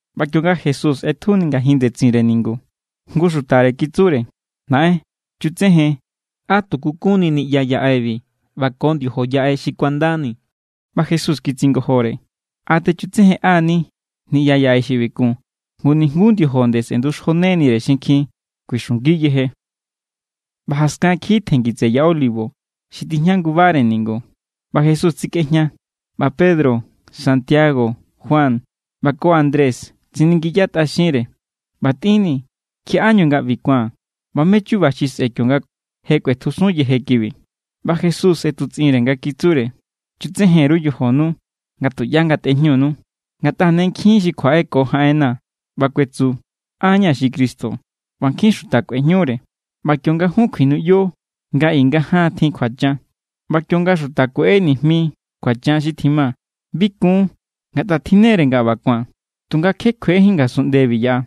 ꞌBa kionga Jesús ꞌetjuni ngajin ndetsinre ningu, jngu xutare kitsure: —¡Naꞌen, chutsejen, á tuku kunni niꞌya yaꞌebi ꞌba ko ndiojo yaꞌe xi kuandani! ꞌBa Jesús kitsingojore: —¿A techutsejenꞌa=ni niꞌya yaꞌe xi ꞌbi kun? Ngu nijnguú ndiojo nde sꞌe̱nduxjonenire xinkjin. kuixungi yeje. ꞌBa jaskan kiji tjenngi tseꞌe Ya Olivo, xi tijña ngubare ningu. ꞌBa Jesús tsikꞌejña, ꞌba Pedro, Santiago, Juan, ꞌba ko Andrés tsiningiyatꞌaxinre: —ꞌBa tꞌinnii̱, ¿kjiaꞌá nga ꞌbi ku̱an, ꞌba mé= chu̱ba̱ xi sꞌe̱ kionga je kꞌuetjusun yeje kibi? ꞌBa Jesús ꞌetutsꞌinre nga kitsure: —Chutsejen_ru yojonu, nga tuꞌyá ngatꞌejñunu. Ngatꞌa ne nkjin xi kjuaꞌe ko jaꞌenna̱ ꞌba kuetsu: “An= ña̱ xi Cristo”; ꞌba nkjin xuta kꞌuejñure. ’ꞌBa kionga jun kjuinuꞌyo nga i nga jaan tjin kjuachan, ꞌba kionga xuta kueꞌe nijmi kjuachan xi tjima, bi kun, ngatꞌa tjinne=re nga ꞌba ku̱an; tunga kje kjuejin ngasunꞌndebi yaꞌa.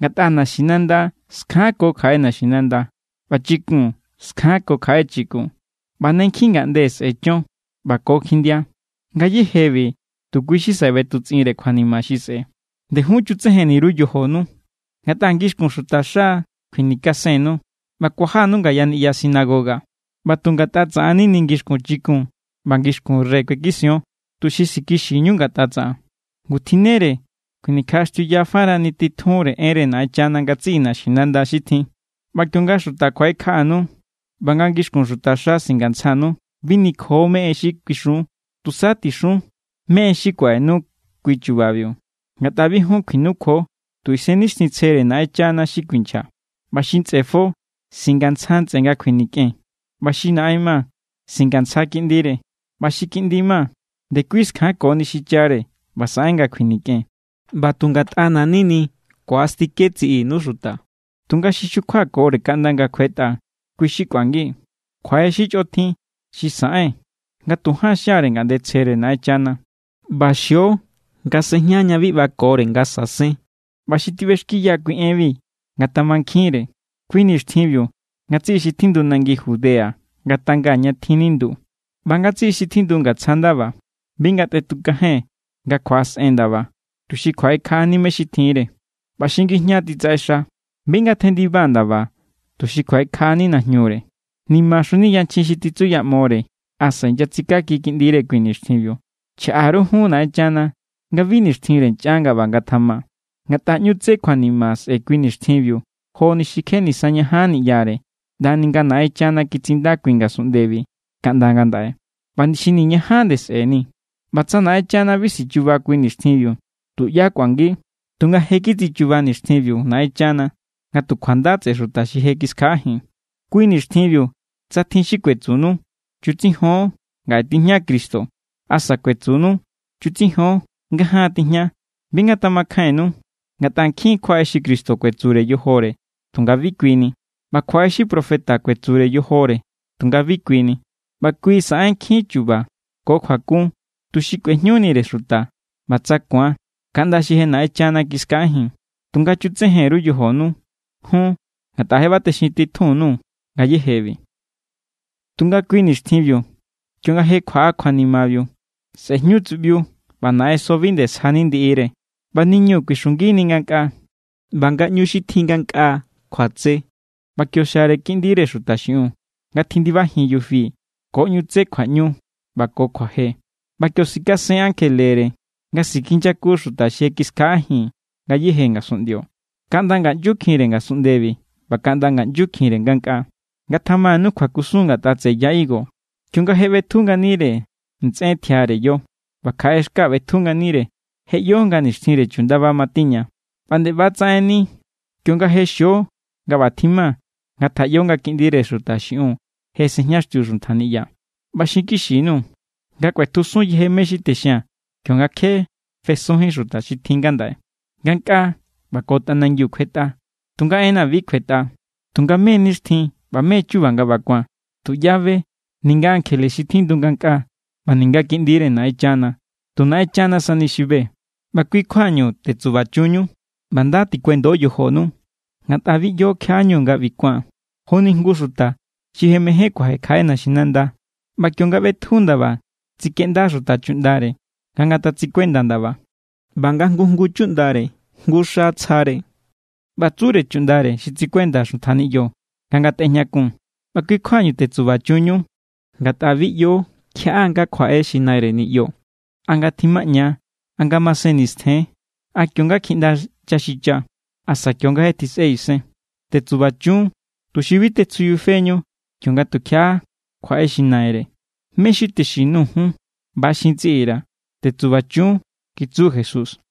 Ngatꞌa naxinanda skjanko kjaꞌe naxinanda, ꞌba chikun skjanko kjaꞌe chikun; ꞌba ne nkjin ngaꞌnde sꞌe̱ chon, ꞌba ko kjindia. Ngayéjebi tu kui= xi saꞌe ꞌbetutsꞌinre kjuanima xi sꞌe̱. ’ꞌNde jun chutsejenni_ru yojonu; ngatꞌa ngixkun xutaxa= kuinikasennu, ꞌba kuajanu ngaya niꞌya sinagoga. ꞌBa nga tu ngatꞌa tsaꞌan= nini ngixkun chikun ꞌba ngixkun rey kuekision, tuxi sikixiñu ngatꞌa tsaꞌan. Ngu tjinnere kjuinikjaꞌaxtiuya farani titjunre enre Naꞌenchana ngatsiꞌi naxinanda xi tjin. ꞌBa kionga xuta kjuaꞌekjaꞌanu ꞌba nga ngixkun xutaxa singantsjanu, bi nikjo mé= en xi kuixun. Tusa tixun mé= en xi kuaꞌenu kui chubabiu; ngatꞌa bi jun kjuinukjuo, tu Isennixtjintsjere Naꞌenchana xi kuinchja. ꞌBa xi ntsꞌe fo singantsja ntsꞌe nga kjuinikꞌen, ꞌba xi naꞌen ma singantsja kiꞌndire; ꞌba xi kiꞌndi ma ndekui skjankoni xichare ꞌba saꞌen nga kjuinikꞌen. ꞌBa tu ngatꞌana̱= nini ku̱astike tsiꞌinu xuta; tunga xi xukjuakore kaꞌnda nga̱ kjuetꞌa, kui xi kꞌuangi. ’Kjuaꞌe xi chꞌotjin xi saꞌen nga tu jaan xiare ngaꞌndetsjere Naꞌenchana, ꞌba xio nga sejña ña bi ꞌbakore nga sa̱sen ¿ꞌba xi tiꞌbexkiya kui enbi ngatamankjinre?, kui nixtjinbiu ngatsiꞌi xi tjindu nangi Judea ngatanga ña tjin nindu. ꞌBa ngatsiꞌi xi tjindu ngatsja ndaba, bi ngatꞌetukajen nga kjuaꞌasꞌen ndaba tuxi kjuaꞌekjaꞌani mé= xi tjinre; ꞌba xi ngijña titsaꞌexa, bi ngatjendiba ndaba tuxi kjuaꞌekjaꞌani najñure. ¡Nimaxunini yanchjin xi titsuyaꞌmore asa inyatsikaki kiꞌndire kui nixtjinbiu! Chjaꞌa_ru jun Naꞌenchana nga bi nixtjinre nchꞌan nga ꞌba ngatjama; ngatꞌa ꞌñu tsé kjuanima sꞌe̱ kui nixtjinbiu joni xi kje nisañajanni ꞌyare, ꞌndani nga̱ Naꞌenchana kitsinda kui ngasunꞌndebi kaꞌnda ngandaꞌe, ꞌba xi niñajani nde sꞌe̱ni. ꞌBa tsa Naꞌenchana bi sichuba kui nixtjinbiu, tuꞌyá kꞌuangi; tunga je kitsichuba nixtjinbiu Naꞌenchana nga tu kjuanda tseꞌe xuta xi je kiskjaꞌajin. ’Kui nixtjinbiu tsa tjin xi kuetsunu: “Chutsijon, ngaꞌe tijña Cristo”, asa kuetsunu: “Chutsijon, ngajaan tijña”, bi ngatamakjainnu. Ngatꞌa nkjin= kjuaꞌe xi Cristo kuetsure yojore tunga bi kui ni. ꞌBa kjuaꞌe xi profeta kuetsure yojore tunga bi kui ni; ꞌba kui saꞌen nkjin chu̱ba̱ ko kjuakun tuxi kꞌuejñunire xuta, ꞌba tsa ku̱an, kaꞌnda xi je Naꞌenchana kiskjaꞌajin. Tunga chutsejen_ru yojonu jun ngatꞌa je ꞌba texintitjun_nuu̱ ngayejebi. ’Tunga kui nixtjinbiu, kionga je kjuaꞌa kjuanimabiu, sꞌe̱ jñu tsuꞌbiu, ꞌba naꞌenso bi nde sjani ndiꞌire, ꞌba niñu kuixungini ngankꞌaa, ꞌba ngaꞌñu xi tjin ngankꞌaa kjuatse. ꞌBa kio xiare Kiꞌndire Xuta xiꞌiun, nga tjindibajin yufi ko ꞌñu tsé kjuaꞌñu ꞌba ko kjuaje. ꞌBa kio sikasen ankjelere, nga sikinyaku xuta xi je kiskjaꞌajin ngayéje ngasunꞌndio, kaꞌnda ngaꞌnyukjinre ngasunꞌndebi ꞌba kaꞌnda ngaꞌnyukjinre ngankꞌaa. ’Ngatjamanu kjuakusun ngatꞌa tseꞌe ya higo: Kionga je ꞌbetju nganire ntsꞌen tjiare yo, ꞌba kjaꞌe xka ꞌbetju nganire, je ꞌyo nga nixtjinre chundaba matiña. ꞌBa nde ꞌba= tsaꞌennire, kionga je xio nga ꞌba tjima, ngatjaꞌyo nga Kiꞌndire Xuta xiꞌiun je sejñaxtiu xuntja niꞌya. ꞌBa xinkixi_nuu̱, nga kꞌuetjusun yeje mé= xi texia̱n kionga kje fesunjín xuta xi tjin ngandaꞌe. Ngankꞌaa ꞌba ko tꞌanangiu kjuetꞌa, tunga enna̱ bi kjuetꞌa. ’Tunga mé= nixtjin ꞌba mé= chuba nga ꞌba ku̱an, tuꞌyá be, ninga ankjele xi tjindu ngankꞌaa, ꞌba ninga Kiꞌndire Naꞌenchana. Tu Naꞌenchana sani xi be. ’ꞌBa kui= kjuañu, tetsubachunñu, ꞌba nda tikuendo yojonu, ngatꞌa bi ꞌyo kjiaꞌá=ñu nga ꞌbi ku̱an. Joni jngu xuta xi je mejen kuaje kjaꞌe naxinanda, ꞌba kionga ꞌbetju ndaba tsikeꞌnda xuta chuꞌndare nga ngatatsikuenda ndaba, ꞌba nga jngu jngu chuꞌndare jngu xa tsjare, ꞌba tsure chuꞌndare xi tsikuenda xuntja niꞌyo nga ngatꞌejñakun. ꞌBa kui= kjuañu tetsubachunñu, ngatꞌa bi ꞌyo kjiaꞌá= nga kjuaꞌe xi naire niꞌyo, a nga tjimaꞌña=, a nga masen nistjen=, a kio=nga kjiꞌnda chaxicha, asa kio=nga je tjisꞌe isen. Tetsubachun, tuxi bi tetsjujñafeñu kionga tukjiaꞌa kjuaꞌe xi naire. Mé xi texin_nuu̱ jun, ꞌba= xin tsiꞌi_ra̱: Tetsubachun —kitsu Jesús.